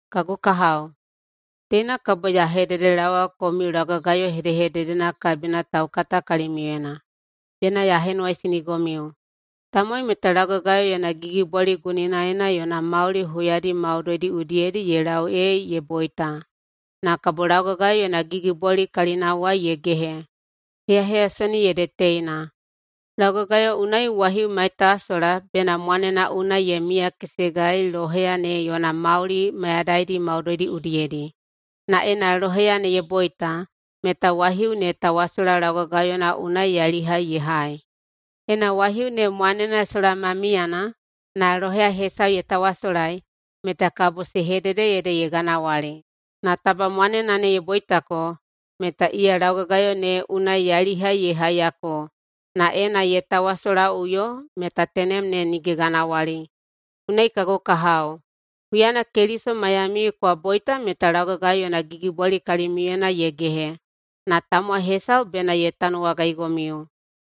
Kagu kahao, teina kabo ya hededelaowa komiu laugagayo hedehededena kabina taukata kalimiuyena. Bena ya henuwaisinigomiu: Tamowai meta laugagayo yona gigibwali guninaena yona mauli huyadi maudoidi udiyedi ye lau ee ye boita, na kabo laugagayo yona gigibwali kalinawai ye gehe. Heyaheyasonina ede teina: Laugagayo unai waihiu maitawasola bena mwanena unai ye miyakesegai loheya ne yona mauli mayadaidi maudoidi udiyedi. Na ena loheya ne ye boita, meta waihiu ne tawasola laugagayona unai yailihai ye hai. Ena waihiu ne mwanena sola ma miyana, na loheya hesau ye tawasolai, meta kabo se hedede ede ye ganawali. Na taba mwanena ne ye boitako, meta iya laugagayo ne unai yailihai ye haiyako, na ena ye tawasolaꞌuyo meta tenem ne nige ganawali. Unai, kagu kahao, huyana Keliso maiyamiu kwa boita meta laugagayo yona gigibwali kalimiuyena ye gehe. Na tamowai hesau bena ye tanuwagaigomiu,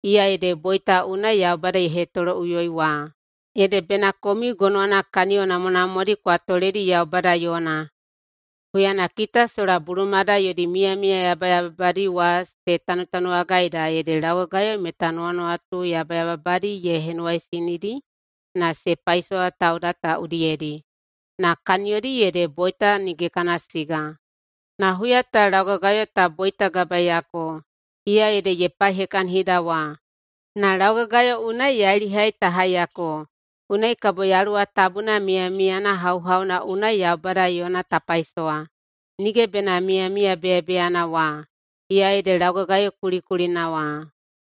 iya ede boita unai Yaubada ye hetoloꞌuyoi wa. Ede bena komiu gonowana kaniyo namwanamwadi kwa toledi Yaubada yona. Huyana kita sola bulumada yodi miyamiya yabayababadi wa se tanutanuwagaida ede laugagayo meta nuwanuwatu yabayababadi ye henuwaisinidi na se paisowa tauda ta udiyedi, na kaniyodi ede boita nige kana siga. Na huya ta, laugagayo ta boitagabaeiyako, iya ede ye paihekahinida wa, na laugagayo unai yailihai ta haiyako. Unai kabo Yaluwa Tabuna miyamiyana hauhauna unai Yaubada yona ta paisowa, nige bena miyamiya beyabeyana wa, iya ede laugagayo kulikulina wa.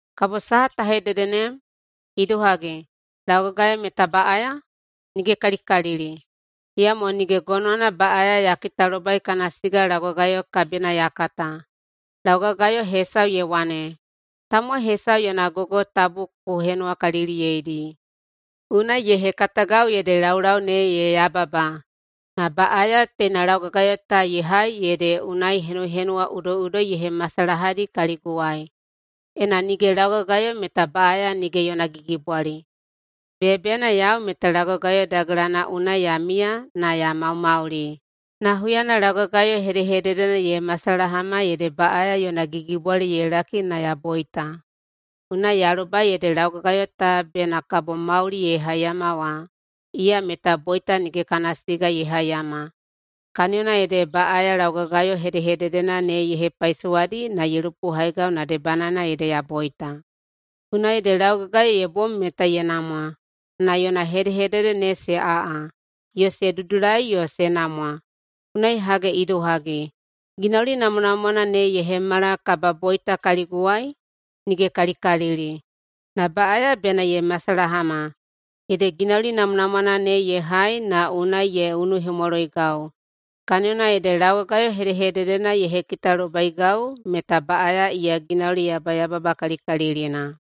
Kabo saha ta hedede nem? Idohagi, laugagayo meta baꞌaya? Nigekalikalili! Iyamo nige gonowana baꞌaya ya kitalobai kana siga laugagayo kabina ya kata. Laugagayo hesau ye wane, “Tamowai hesau yona gogo tabu ku henuwakaliliyeidi.” Unai ye hekatagau ede laulau ne ye yababa. Na baꞌaya teina laugagayo ta ye hai ede unai henuhenuwa udoiꞌudoi ye hemasalahadi kaliguwai. Ena nige laugagayo meta baꞌaya nige yona gigibwali. Beyabeyana, yau meta laugagayo dagelana unai ya miya na ya maumauli. Na huyana laugagayo hedehededena ye masalahama ede baꞌaya yona gigibwali ye laki na ya boita. Unai ya lobai ede laugagayo ta bena kabo mauli ye haiyama wa, iya meta boita nige kana siga ye haiyama. Kaniyona ede baꞌaya laugagayo hedehededena ne ye hepaisowadi na ye lupohaigau na debanaena ede ya boita. Unai ede laugagayo ye bom meta ye namwa, na yona hedehedede ne se aꞌa yo se dudulai yo se namwa. Unai hage idohagi, ginauli namwanamwana ne ye hemala kababoita kaliguwai? Nigekalikalili! Na baꞌaya bena ye masalahama, ede ginauli namwanamwana ne ye hai na unai ye unuhemwaloigau. Kaniyona ede laugagayo hedehededena ye hekitalobaigau meta baꞌaya iya ginauli yabayababakalikalilina.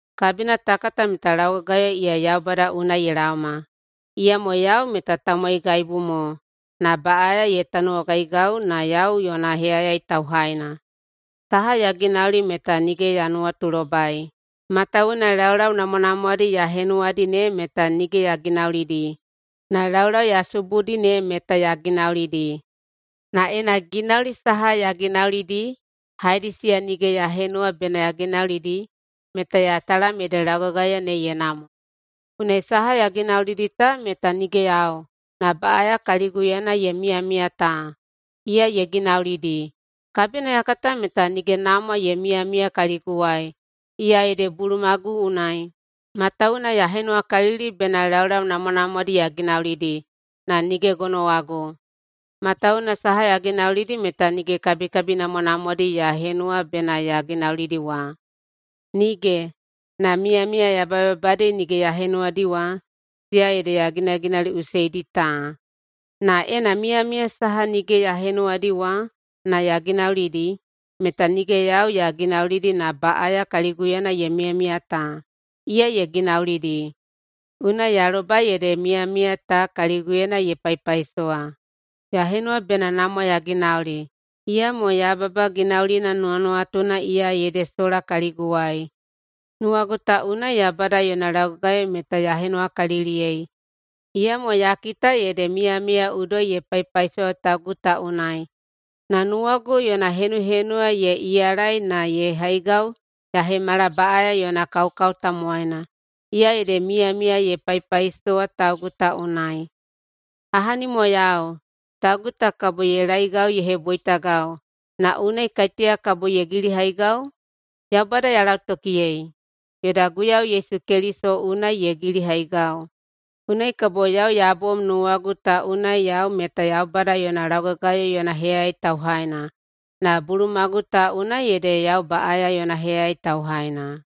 Kabina ta kata meta laugagayo iya Yaubada unai ye laoma, iyamo yau meta tamowaigaibu mo na baꞌaya ye tanuwagaigau na yau yona heyayai tauhaina. Saha ya ginauli meta nige ya nuwatulobai, matawuwuna laulau namwanamwadi ya henuwadi ne meta nige ya ginaulidi, na laulau ya subudi ne meta ya ginaulidi. Na ena ginauli saha ya ginaulidi, haedi siya nige ya henuwa bena ya ginaulidi, meta ya talam ede laugagayo ne ye namwa. Unai saha ya ginaulidi ta meta nige yau, na baꞌaya kaliguyena ye miyamiya ta, iya ye ginaulidi. Kabina ya kata meta nige namwa ye miyamiya kaliguwai, iya ede bulumagu unai. Matawuwuna ya henuwakalili bena laulau namwanamwadi ya ginaulidi, na nige gonowagu. Matawuwuna saha ya ginaulidi meta nige kabikabi namwanamwadi ya henuwa bena ya ginaulidi wa. Nige! Na miyamiya yabayababadi nige ya henuwadi wa, siya ede ya ginaginauliꞌuseidi ta. Na ena miyamiya saha nige ya henuwadi wa na ya ginaulidi, meta nige yau ya ginaulidi na baꞌaya kaliguyena ye miyamiya ta, iya ye ginaulidi. Unai ya lobai ede miyamiya ta kaliguyena ye paipaisowa: Ya henuwa bena namwa ya ginauli, iyamo yababa ginaulina nuwanuwatuna iya ede sola kaliguwai. Nuwagu ta unai Yaubada yona laugagayo meta ya henuwakaliliyei, iyamo ya kita ede miyamiya udoi ye paipaisowa taugu ta unai na nuwagu yona henuhenuwa ye iyalai na ye haigau ya hemala baꞌaya yona kaukau tamowaina, iya ede miyamiya ye paipaisowa taugu ta unai. Ahani mo yau! Taugu ta kabo ye laeigau ye heboitagau, na unai kaiteya kabo ye gilihaigau? Yaubada ya lautokiyei, yoda Guiyau Yesu Keliso unai ye gilihaigau. Unai kabo yau ya bom nuwagu ta unai yau meta Yaubada yona laugagayo yona heyayai tauhaina, na bulumagu ta unai ede yau baꞌaya yona heyayai tauhaina.